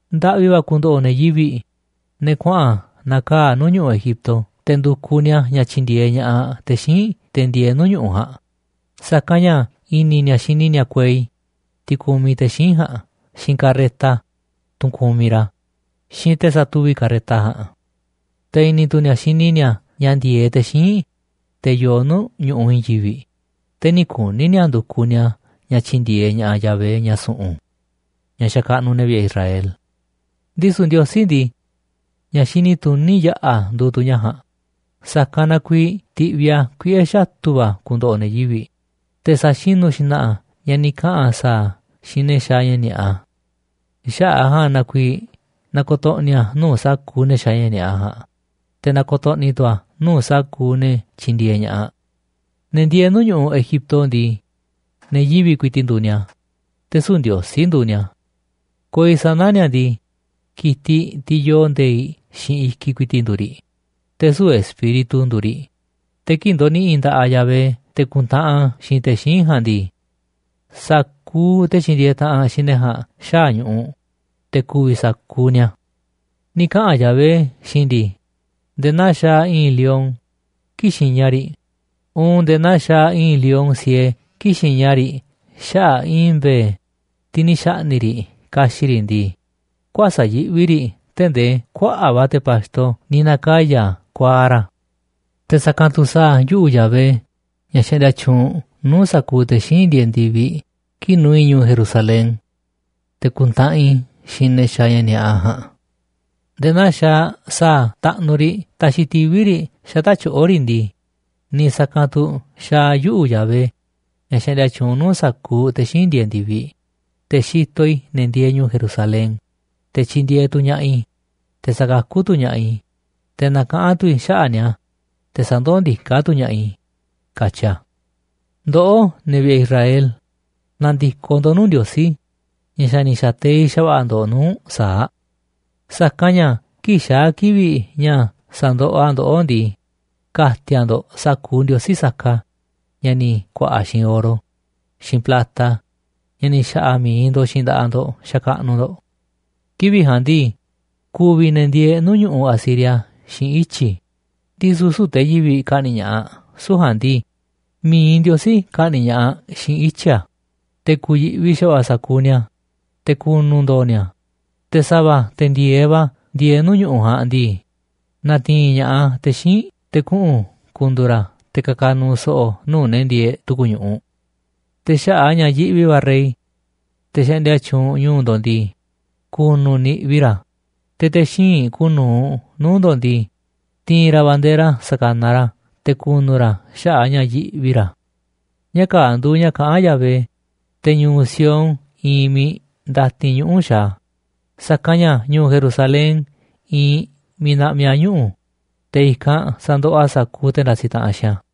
Ndaꞌvi va̱ ku̱ndo̱ꞌo̱ ne̱ yivi̱ꞌ, ne̱ kuaꞌa̱n na̱kaa̱ꞌ nuu̱ꞌ ñu̱ꞌuꞌ Egipto te̱ ndu̱kuꞌ ni̱a̱ ña̱ tyi̱ndi̱e̱eꞌ ña̱ꞌaꞌ te̱ xíinꞌ, te̱ ndieeꞌ nuu̱ꞌ ñu̱ꞌuꞌ ja̱a̱nꞌ, sa̱kanꞌ ña̱ i̱ni̱ ni̱a̱ xini ni̱a̱ kuei, tiꞌ kumiꞌ te̱ xíinꞌ ja̱a̱nꞌ, xiinꞌ carreta, tunꞌ kumiꞌ ra̱, xiinꞌ te̱ satuvi̱ꞌ carreta ja̱a̱nꞌ. Te̱ i̱ni̱ tu̱ ni̱a̱ xini ni̱a̱ ña̱ ndi̱e̱eꞌ te̱ xíinꞌ, te̱ yoo nuu̱ꞌ ñu̱ꞌuꞌ i̱i̱n yivi̱ꞌ, te̱ nï̱ kuni̱ ni̱a̱ ndu̱kuꞌ ni̱a̱ ña̱ tyi̱ndi̱e̱eꞌ ña̱ꞌaꞌ Yahvé, ña̱ su̱ꞌu̱n, ña̱ xakaꞌnuꞌ ne̱ vi̱ꞌe̱ Israel. Ndisu̱ Ndiosí ndii, ña̱ xini tuní yaꞌa̱ nduuꞌ tu̱ ña̱ ja̱a̱nꞌ, sa̱kanꞌ na kuiiꞌ ti̱ꞌviꞌ a̱ kuiꞌe̱ xatu̱ va̱ ku̱ndo̱ꞌo̱ ne̱ yivi̱ꞌ, te̱ sa̱xinu̱ xna̱ꞌa̱ a̱ ña̱ ni̱ kaꞌa̱n a̱ sa̱a̱ xiinꞌ ne̱ xaaꞌ ña̱ ni̱a̱ꞌa. Xaꞌa̱ꞌ a̱ ja̱a̱nꞌ na kuiiꞌ na̱ko̱to̱ꞌni̱ a̱ nuu̱ꞌ sa̱kuuꞌ ne̱ xaaꞌ ni̱a̱ꞌa ja̱a̱nꞌ, te̱ na̱ko̱to̱ꞌni̱ tu̱ a̱ nuu̱ꞌ sa̱kuuꞌ ne̱ tyindieeꞌ ña̱ꞌaꞌ. Ne̱ ndieeꞌ nuu̱ꞌ ñu̱ꞌuꞌ Egipto ndii, ne̱ yivi̱ꞌ ku̱i̱ti̱ꞌ nduuꞌ ni̱a̱, te̱ süu̱ꞌ ndiosí nduuꞌ ni̱a̱. Kuei sana̱ ni̱a̱ ndii, ki̱tiꞌ, tiꞌ yoo nde̱i̱ꞌ xiinꞌ i̱kiꞌ ku̱i̱ti̱ꞌ, nduuꞌ riꞌ, te̱ süu̱ꞌ espíritu nduuꞌ riꞌ. Te̱ kii̱ꞌ ndo̱ni̱ꞌi̱ nda̱ꞌaꞌ Yahvé te̱ ku̱ntaꞌanꞌ a̱ xiinꞌ te̱ xíinꞌ ja̱a̱nꞌ ndii, sa̱kuuꞌ te̱ tyindieeꞌ taꞌanꞌ xiinꞌ ne̱ ja̱a̱nꞌ xaa̱ ñu̱ꞌuꞌ, te̱ ku̱vi̱ sa̱kuuꞌ ni̱a̱. Ni̱ kaꞌa̱n Yahvé xiinꞌ i̱ ndii: “Nde̱e̱ naa xaaꞌ i̱i̱n lion kii̱ꞌ xiña riꞌ uun nde̱e̱ naa xaaꞌ i̱i̱n lion siee kii̱ꞌ xiña riꞌ xaꞌa̱ꞌ i̱i̱n mbe̱e̱, tiꞌ ni̱ xa̱ꞌni̱ꞌ riꞌ ka̱xi̱ꞌ riꞌ ndii, kuäsa̱ꞌ yiꞌvi riꞌ tee̱ꞌ ndee kuaꞌa̱ꞌ va̱ te̱ pa̱xto ni̱ na̱kaya̱ kuaaꞌ ra̱. Te̱ sa̱kanꞌ tu̱ sa̱a̱ yuꞌu̱ Yahvé, ña̱ xaꞌndia tyuunꞌ nuu̱ꞌ sa̱kuuꞌ te̱ xíinꞌ ndieeꞌ ndi̱viꞌ, kii̱ꞌ nu̱u̱ i̱ ñu̱u̱ Jerusalén te̱ ku̱ntaꞌanꞌ i̱ xiinꞌ ne̱ xaaꞌ ña̱ ni̱a̱ꞌa ja̱a̱nꞌ. Nde̱e̱ naa xaaꞌ sa̱a̱ taꞌnuꞌ riꞌ taxiꞌ tivi̱ riꞌ xata̱ꞌ tyoꞌo̱ riꞌ ndii, niiꞌ sa̱kanꞌ tu̱ xaaꞌ yuꞌu̱, Yahvé, ña̱ xaꞌndia tyuunꞌ nuu̱ꞌ sa̱kuuꞌ te̱ xíinꞌ ndieeꞌ ndi̱viꞌ, te̱ xitoꞌ i̱ ne̱ ndieeꞌ ñu̱u̱ Jerusalén, te̱ tyindieeꞌ tu̱ ña̱ꞌaꞌ i̱, te̱ sakakú tu̱ ña̱ꞌaꞌ i̱, te̱ nakaꞌán tu̱ i̱ xaꞌa̱ꞌ ni̱a̱, te̱ sandoó ndiká tu̱ ña̱ꞌaꞌ i̱”, katyi a̱. Ndoꞌó, ne̱ vi̱ꞌe̱ Israel, na̱ndi̱koꞌ ndo̱ꞌ nuu̱ꞌ Ndiosí ña̱ xa̱ ni̱ xa̱teiꞌ xa̱va̱ꞌa̱ ndo̱ꞌ nuu̱ꞌ sa̱aꞌ. Sa̱kanꞌ ña̱ kii̱ꞌ xaa̱ kivi̱ꞌ ña̱ sa̱ndoꞌoꞌ a̱ ndoꞌó ndii, ka̱ti̱a̱ ndo̱ꞌ sa̱kuuꞌ ndiosí saka ña̱ ni̱ ku̱a̱ꞌa̱ xiinꞌ oro xiinꞌ plata, ña̱ ni̱ xa̱ꞌa̱ mi̱iꞌ ndo̱ꞌ xiinꞌ nda̱ꞌaꞌ ndo̱ꞌ xakaꞌnuꞌ ndo̱ꞌ. “Kivi̱ꞌ ja̱a̱nꞌ ndii, ku̱vi̱ ne̱ ndieeꞌ nuu̱ꞌ ñu̱ꞌuꞌ Asiria xiinꞌ ityi̱, ndisu̱ süu̱ꞌ te̱ yivi̱ꞌ ka̱ꞌni̱ꞌ ña̱ꞌaꞌ. Süu̱ꞌ ja̱a̱nꞌ ndii, mi̱iꞌ Ndiosí ka̱ꞌni̱ꞌ ña̱ꞌaꞌ xiinꞌ ityi̱ a̱, te̱ ku̱yi̱ꞌvi xa̱va̱ꞌa̱ sa̱kuuꞌ ni̱a̱, te̱ ku̱nu̱ ndo̱o̱ ni̱a̱. Te̱ sa̱va̱, te̱ ndi̱e̱eꞌ va̱ ndieeꞌ nuu̱ꞌ ñu̱ꞌuꞌ ja̱a̱nꞌ ndii, na̱ti̱i̱n ña̱ꞌaꞌ te̱ xíinꞌ te̱ kuꞌu̱n ku̱ndu̱u̱ ra̱ te̱ ka̱ka̱ nu̱u̱ so̱ꞌo̱ nuu̱ꞌ ne̱ ndieeꞌ tu̱ku̱ ñu̱ꞌuꞌ. Te̱ xaꞌa̱ꞌ a̱ ña̱ yiꞌvi va̱ rey, te̱ xaꞌndia tyuunꞌ ñu̱u̱ ndo̱ꞌ ndii, ku̱nu̱ niꞌvi ra̱, te̱ te̱ xíinꞌ kuuꞌ nu̱uꞌ nuu̱ꞌ ndo̱ꞌ ndii, ti̱i̱n ra̱ bandera sa̱kanaꞌ ra̱ te̱ ku̱nu̱ ra̱ xaꞌa̱ꞌ a̱ ña̱ yiꞌvi ra̱.” Ña̱ kaa̱ꞌ nduuꞌ ña̱ kaꞌán Yahvé, te̱ ñu̱u̱ Sión iinꞌ miiꞌ ndatin ñuꞌu̱ xaaꞌ a̱, saka̱nꞌ ña̱ ñu̱u̱ Jerusalén iinꞌ miiꞌ naꞌmiꞌ a̱ ñuꞌu̱, te̱ i̱kanꞌ sa̱ndoꞌoꞌ a̱ sa̱kuuꞌ te̱ ndasiꞌ taꞌanꞌ xiinꞌ a̱.